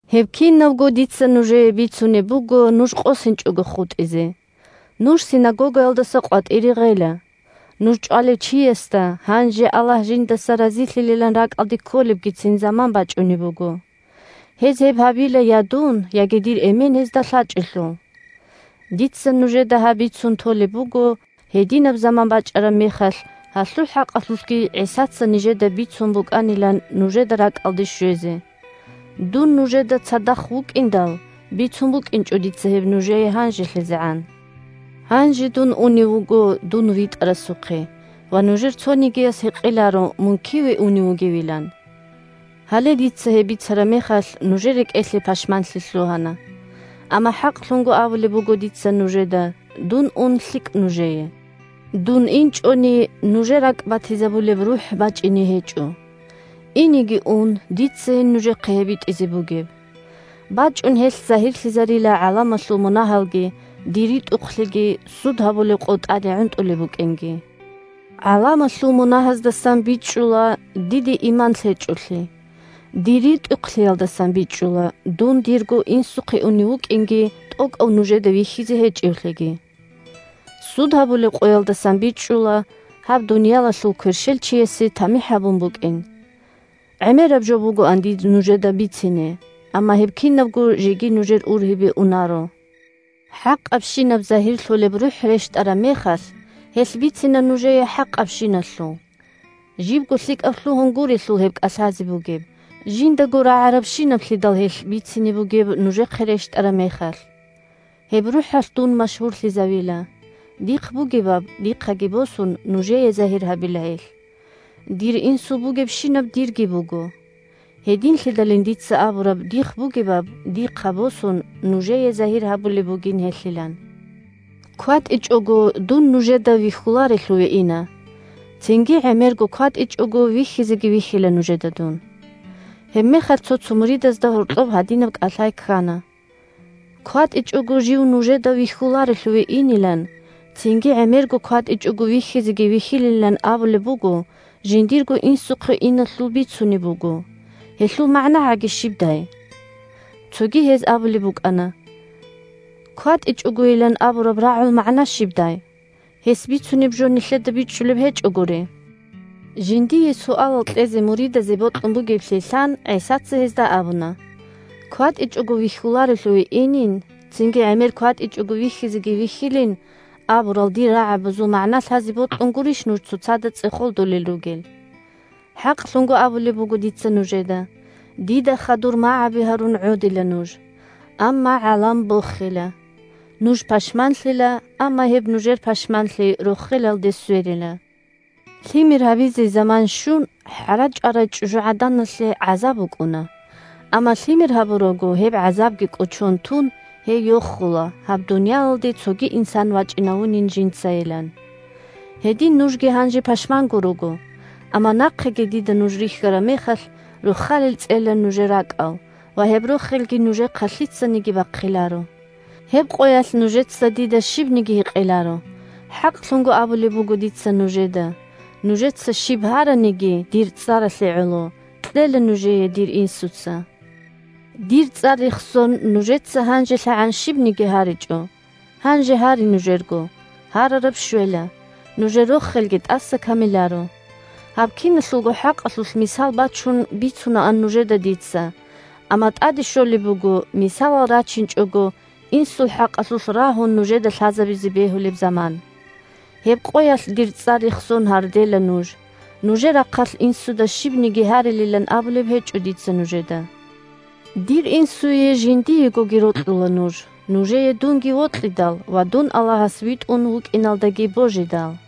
Гьеб кинабго дица нужее бицунеб буго нуж къосинчӀого хутӀизе. Нуж синагогаялдаса къватӀире гъела. Нуж чӀвалев чиясда гьанже Аллагь жиндаса разилъилилан ракӀалде кколебгицин заман бачӀунеб буго. Гьез гьеб гьабила я дун, яги дир Эмен гьезда лъачӀелъул. Дица нужеда гьаб бицун толеб буго, гьединаб заман бачӀараб мехалъ гьалъул хӀакъалъулъги ГӀисаца нижеда бицун букӀанилан нужеда ракӀалде щвезе. Илагьияб РухӀалъул ишазул хӀакъалъулъ Дун нужеда цадахъ вукӀиндал бицун букӀинчӀо дица гьеб нужее гьанжелъизегӀан. Гьанже дун унев вуго дун ВитӀарасухъе, ва нужер цонигияс гьикъиларо мун киве унев вугевилан. Гьале, дица гьеб бицараб мехалъ, нужер рекӀелъе пашманлъи лъугьана. Амма хӀакълъун абулеб буго дица нужеда: дун ун лъикӀ нужее. Дун инчӀони, нужер ракӀбатизабулеб РухӀ бачӀине гьечӀо. Инеги ун, дицайин нужехъе гьеб битӀизе бугеб. БачӀун гьелъ загьирлъизарила гӀаламалъул мунагьалги, дир ритӀухълъиги, суд гьабулеб къо тӀаде гӀунтӀулеб букӀинги. «ГӀаламалъул мунагьаздасан» бичӀчӀула – диде иман лъечӀолъи; «дир ритӀухълъиялдасан» бичӀчӀула – дун дирго Инсухъе унев вукӀинги тӀокӀав нужеда вихьизе гьечӀевлъиги. «Суд гьабулеб къоялдасан» бичӀчӀула – гьаб дуниялалъул кверщелчиясе тамихӀ гьабун букӀин. ГӀемераб жо бугоан дир нужеда бицине, амма гьеб кинабго жеги нужер ургьибе унаро. ХӀакъабщинаб загьирлъулеб РухӀ рещтӀараб мехалъ, гьелъ бицина нужее хӀакъабщиналъул. Жибго лъикӀаб лъугьун гурелъул гьеб кӀалъазе бугеб, жиндаго рагӀарабщинаблъидал гьелъ бицине бугеб нужехъе рещтӀараб мехалъ. Гьеб РухӀалъ дун машгьурлъизавила. Дихъ бугебаб, дихъаги босун, нужее загьир гьабила гьелъ. Дир Инсул бугебщинаб дирги буго. Гьединлъидалин дица абураб дихъ бугебаб, дихъа босун, нужее загьир гьабулеб бугин гьелъилан. КватӀичӀого дун нужеда вихьуларелъуве ина. Цинги гӀемерго кватӀичӀого вихьизеги вихьила нужеда дун. Гьебмехалъ цо-цо муридазда гьоркьоб гьадинаб кӀалъай ккана: – КватӀичӀого жив нужеда вихьуларелъуве инилан, цинги гӀемерго кватӀичӀого вихьизеги вихьилилан абулеб буго, жиндирго Инсухъе иналъул бицунеб буго. Гьелъул магӀнагӀаги щибдай? Цоги гьез абулеб букӀана: – КватӀичӀогойилан абураб рагӀул магӀна щибдай? Гьес бицунеб жо нилъеда бичӀчӀулеб гьечӀогури. Жиндие суалал кьезе муридазе бокьун бугеблъи лъан, ГӀисаца гьезда абуна: – КватӀичӀого вихьуларелъуве инин, цинги гӀемер кватӀичӀого вихьизеги вихьилин абурал дир рагӀабазул магӀна лъазе бокьун гурищ нуж цоцазда цӀехолдулел ругел? ХӀакълъун абулеб буго дица нужеда: дида хадур магӀаби гьарун гӀодила нуж. Амма гӀалам бохила. Нуж пашманлъила, амма гьеб нужер пашманлъи рохелалде сверила. Лъимер гьабизе заман щун, хӀара чӀварай чӀужугӀаданалъе гӀазаб букӀуна. Амма лъимер гьабурабго, гьеб гӀазабги кӀочон тун, гьей йохула гьаб дуниялалде цоги инсан вачӀинавунин жинцайилан. Гьедин нужги гьанже пашманго руго, амма нахъеги дида нуж рихьараб мехалъ, рохалил цӀела нужер ракӀал ва гьеб рохелги нужехъа лъицаниги бахъиларо. Гьеб къоялъ нужеца дида щибниги гьикъиларо. ХӀакълъун абулеб буго дица нужеда: нужеца щиб гьараниги, дир цӀаралъе гӀоло, кьела нужее дир Инсуца. Дир цӀар рехсон нужеца гьанжелъагӀан щибниги гьаричӀо. Гьанже гьаре нужерго, гьарараб щвела, нужер рохелги тӀаса камиларо. «Дун гьаб дуниялалдаса бергьана» Гьаб киналъулго хӀакъалъулъ мисал бачун бицунаан нужеда дица. Амма тӀаде щолеб буго, мисалал рачинчӀого, Инсул хӀакъалъулъ рагьун нужеда лъазабизе бегьулеб заман. Гьеб къоялъ дир цӀар рехсон гьардела нуж. Нужер рахъалъ Инсуда щибниги гьарилилан абулеб гьечӀо дица нужеда. Дир Инсуе жиндиегоги рокьула нуж, нужее дунги вокьидал ва дун Аллагьас витӀун вукӀиналдаги божидал.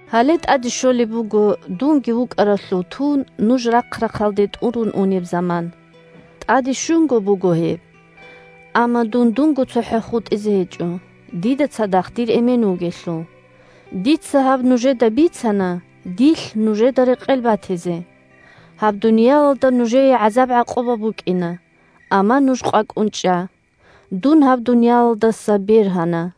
Гьале тӀаде щолеб буго, дунги вукӀаралъув тун, нуж рахъ-рахъалде тӀурун унеб заман. ТӀаде щунго буго гьеб! Амма дун дунго цохӀо хутӀизе гьечӀо, дида цадахъ дир Эмен вугелъул. Дица гьаб нужеда бицана, дилъ нужеда рекъел батизе. Гьаб дуниялалда нужее гӀазаб-гӀакъуба букӀина. Амма нуж къвакӀун чӀа. Дун гьаб дуниялалдаса бергьана.